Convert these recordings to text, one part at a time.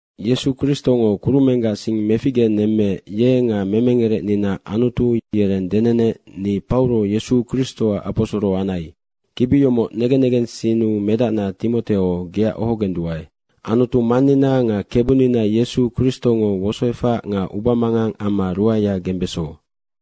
Yesu Kristongo kurumenggac sing meficgenemmeec, ye nga memengerecnina Anutu yereng denenec, ni Pauro Yesu Kristoac aposoro anai. Kibi yomoc negen negensinnu medacna Timoteo, geac ohogenduae. Anutu Mannina nga Kebunina Yesu Kristongo wosoefac nga ubamangang amma ruaea gembeso.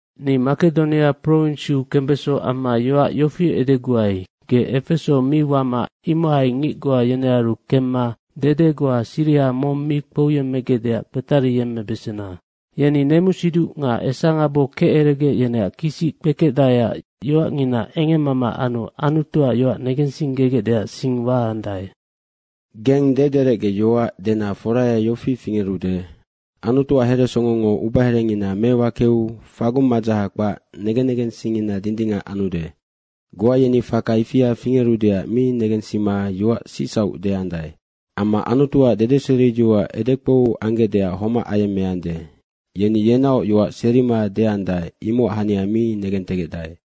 Ni Makedonia prowinsiu kembeso amma yoac yofi edeguai, ge Efeso mi wama imohai ngic goa yenearu kemma dede goa siriha mong mi kpouyemmegecdeac kpetariyemmebesena. Yeni nemusiduc nga esangabo keceregec yeneac kisic kpekecdaeac yoacngina engemmama anu Anutuac yoac negensinggegecdeac sing waandae. Geng dederecgeyoac dena foraya yofi fingerude, Anutuac heresongongo ubaherengina mewakeu fagung madzaha kpac negen negengsingngina dindingac anude. Goa yeni faka ifia fingerudeac mi negensima yoac sicsauc deandae. Amma Anutuac dedeseriyoac edekpou anggecdeac homac ayemmeande. Yeni yenaoc yoac serima deandae, imocac hania mi negentegecdae.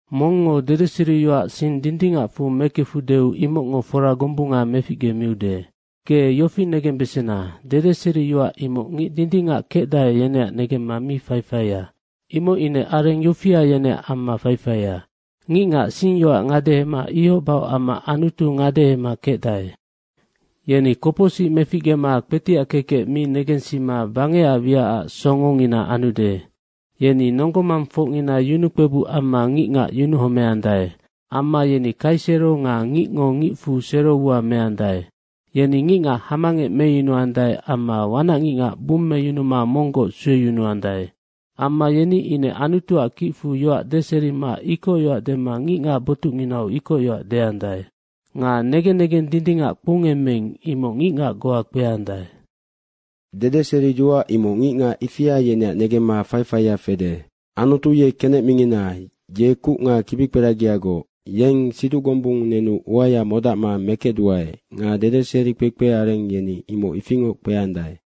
Mongngo dedeseriyoac sing dindingacfu mekefudeu imocngo fora gombunga meficgemiude. Ge yofi negembesena, dedeseriyoac imoc ngic dindingac kecdae, yeneac negemma mi faifaia. Imoc ine areng yofia yeneac amma faifaia, ngicngac singyoac ngadehema ihoc bahoc amma Anutu ngadehema kecdae. Yeni kopocsic meficgema kpetiac kekec mi negensima bangecac wiacac songongina anude. Yeni nonggo mangfocngina yunukpebuc amma ngicngac yunuhomeandae. Amma yeni kaisero nga ngicngo ngicfu sero ua meandae. Yeni ngicngac hamangec meyunuandae amma wanacngicngac bummeyunuma monggoc sueyunuandae. Amma yeni ine Anutuac kicfu yoac deserima ikocyoac dema ngicngac botucnginau ikocyoac deandae. Nga negen negeng dindingac kpoungemmeing, imoc ngicngac goa kpeandae. Dedeseriyoac imoc ngicngac ifia yeneac negemma faifaia fede. Anutu ye kenec mingina ye kuc nga kibikperagiagoc. Yeng siduc gombung nenu uaya modacma mekecduae nga dedeseri kpekpe areng yeni imoc ifingoc kpeandae.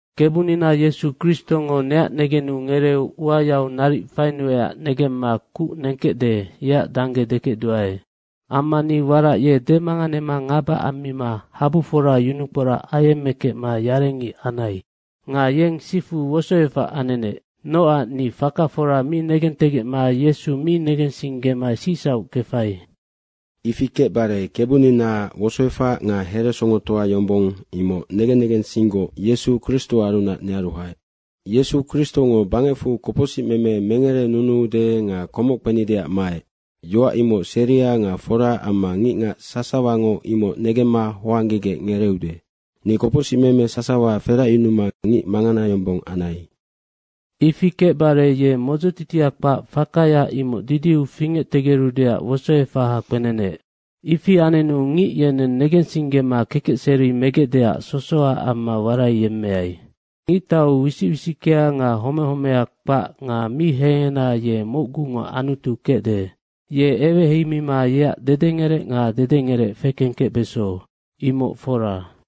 Kebunina Yesu Kristongo neac negenu ngereeu uayau naric fainuecac negemma kuc nengkecde, yeac dangge dekecduae. Amma ni warac ye demanganema ngaba ammima habufora yunukporac ayemmekecma yarengic anai. Nga yeng sifu wosoefac anenec. Nocac ni faka fora mi negentegecma Yesu mi negensinggema sicsauc kefai. Ifi kecbare Kebuninaac wosoefac nga heresongotoa yombong, imoc negen negensinggoc Yesu Kristoarunac nearu haec. Yesu Kristongo bangecfu kopocsicmeme mengerenunuude nga komoc kpenideac maec. Yoac imoc seria nga fora amma ngicngac sasawango imoc negemma hoanggegec ngereeude. Ni kopocsimeme sasawa feracyunuma ngic mangana yombong anai. Ifi kecbare, ye modzotitia kpac fakaya imoc didiu fingectegerudeac wosoefaha kpenenec. Ifi anenu ngic yeneng negensinggema kekecseri megecdeac sosoha amma waraiyemmeai. Ngictau wisic wisickea nga home homea kpac nga mi hengena ye mocgungo Anutu kecde. Ye eweheimima yeac dedengerec nga dedengerec fekengkecbeso, imoc fora.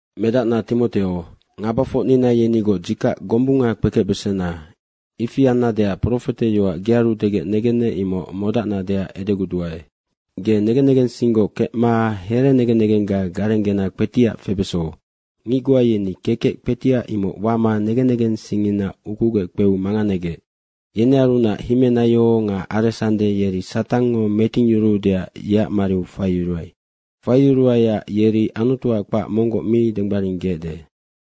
Medacna Timoteo, ngabafocnina yenigoc dzikac gombunga kpekecbesena. Ifi annadeac profete yoac gearu degec negennec. Imoc modacnadeac edeguduae. Ge negen negensinggoc kecma herenegen negengga garenggena kpetiac febeso. Ngic goa yeni kekec kpetiac imoc wama negen negensingngina ukugec kpeu manganegec. Nga yenearunac Himenaio nga Aresande, yeri Satangngo metingyuruudeac yeac mariu faiyuruai. Faiyuruaiac yeri Anutuac kpac monggoc mi denggbaringgeecde.